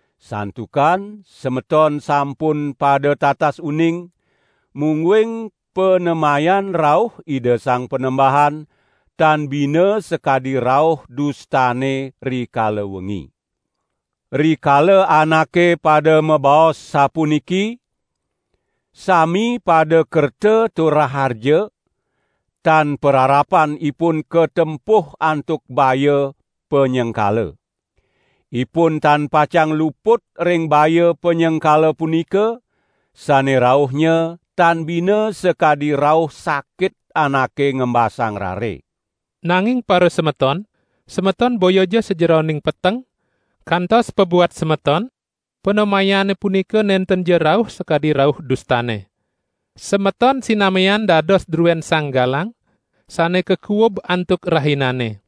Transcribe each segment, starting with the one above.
Santukan semeton sampun pada tatas uning, mungguing panemayan rauh Ida Sang Panembahan tan bina sakadi rauh dustane rikala wengi. Rikala anake pada mabaos sapuniki: "Sami pada kerta tur raharja," tan pararapan ipun katempuh antuk baya panyengkala. Ipun tan pacang luput ring baya panyengkala punika, sane rauhnya tan bina sakadi rauh sakit anake ngembasang rare. Nanging parasemeton, semeton boyaja sajeroning peteng, kantos pabuat semeton panemayane punika nentenja rauh sakadi rauh dustane. Semeton sinamian dados druen sang galang, sane kakuub antuk rahinane.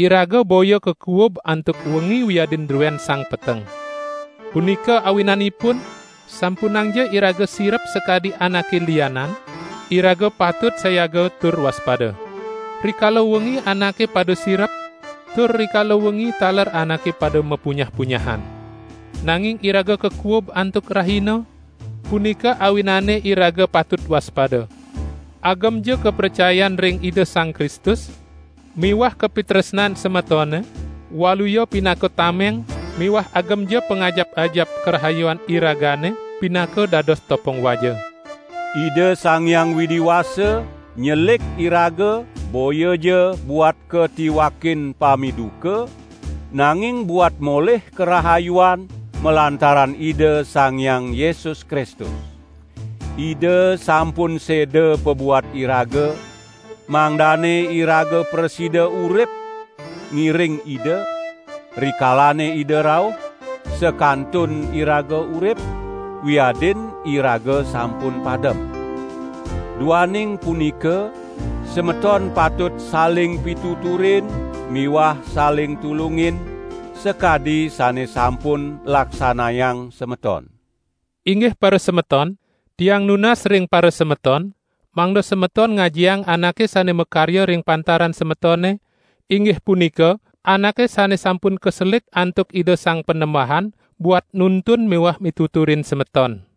Iraga boya kakuub antuk wengi wiadin druen sang peteng. Punika awinanipun sampunangja iraga sirep sakadi anake lianan; iraga patut sayaga tur waspada. Rikala wengi anake pada sirep, tur rikala wengi taler anake pada mapunyah-punyahan. Nanging iraga kakuub antuk rahina, punika awinane iraga patut waspada. Agemja kapracayan ring Ida Sang Kristus miwah kapitresnan semetone, waluya pinaka tameng miwah agemja pangajap-ajap karahayuan iragane pinaka dados topong waja. Ida Sang Hyang Widi Wasa nyelik iraga boyaja buat katiwakin pamiduka, nanging buat molih karahayuan malantaran Ida Sang Hyang Yesus Kristus. Ida sampun seda pabuat iraga, mangdane iraga prasida urip ngiring Ida, rikalane Ida rauh, sakantun iraga urip, wiadin iraga sampun padem. Duaning punika semeton patut saling pituturin miwah saling tulungin, sakadi sane sampun laksanayang semeton. Inggih parasemeton, tiang nunas ring parasemeton, mangda semeton ngajiang anake sane makarya ring pantaran semetone, inggih punika anake sane sampun kaselik antuk Ida Sang Panembahan buat nuntun miwah mituturin semeton.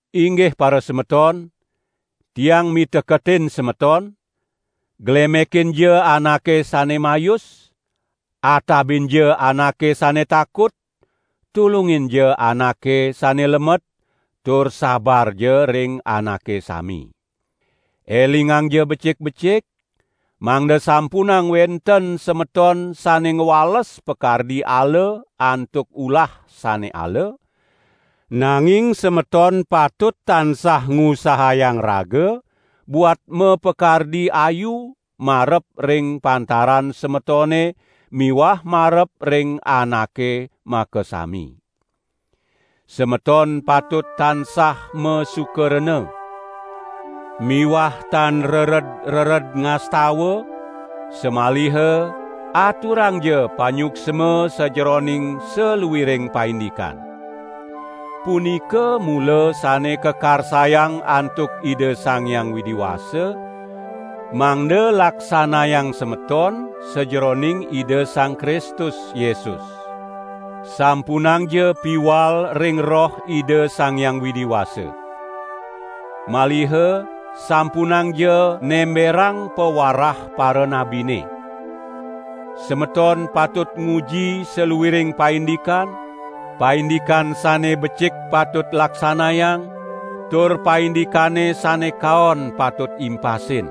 Inggih parasemeton, tiang miteketin semeton; glemekinja anake sane mayus, atabinja anake sane takut, tulunginja anake sane lemet, tur sabarja ring anake sami. Elingangja becik-becik, mangda sampunang wenten semeton sane ngwales pakardi ala antuk ulah sane ala, nanging semeton patut tansah ngusahayang raga buat mapakardi ayu marep ring pantaran semetone miwah marep ring anake makasami. Semeton patut tansah masuka rena! Miwah tan rered-rered ngastawa, samaliha aturangja panyuksma sajeroning saluiring paindikan. Punika mula sane kakarsayang antuk Ida Sang Hyang Widi Wasa, mangda laksanayang semeton sajeroning Ida Sang Kristus Yesus. Sampunangja piwal ring Roh Ida Sang Hyang Widi Wasa. Maliha sampunangja nemberang pawarah paranabine. Semeton patut nguji saluiring paindikan: paindikan sane becik patut laksanayang, tur paindikane sane kaon patut impasin!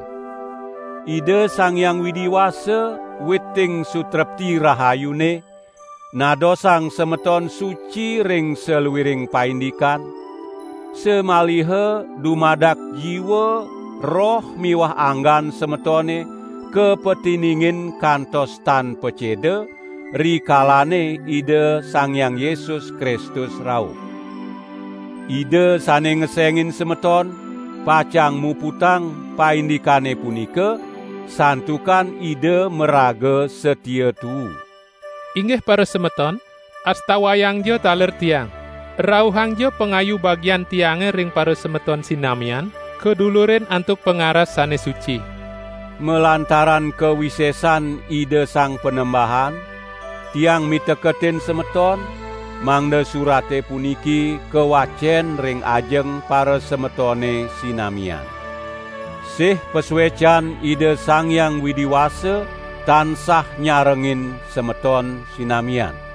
Ida Sang Hyang Widi Wasa, witing sutrepti rahayune, nadosang semeton suci ring saluiring paindikan, samaliha dumadak jiwa, roh miwah anggan semetone kapatiningin kantos tan paceda, rikalane Ida Sang Hyang Yesus Kristus rauh. Ida sane ngesengin semeton, pacang muputang paindikane punika, santukan Ida maraga satia tuu. Inggih parasemeton, astawayangja taler tiang. Rauhangja pangayu bagian tiange ring parasemeton sinamian kadulurin antuk pangaras sane suci. Malantaran kawisesan Ida Sang Panembahan tiang miteketin semeton mangda surate puniki kawacen ring ajeng parasemetone sinamian. Sih pasuecan Ida Sang Hyang Widi Wasa tansah nyarengin semeton sinamian.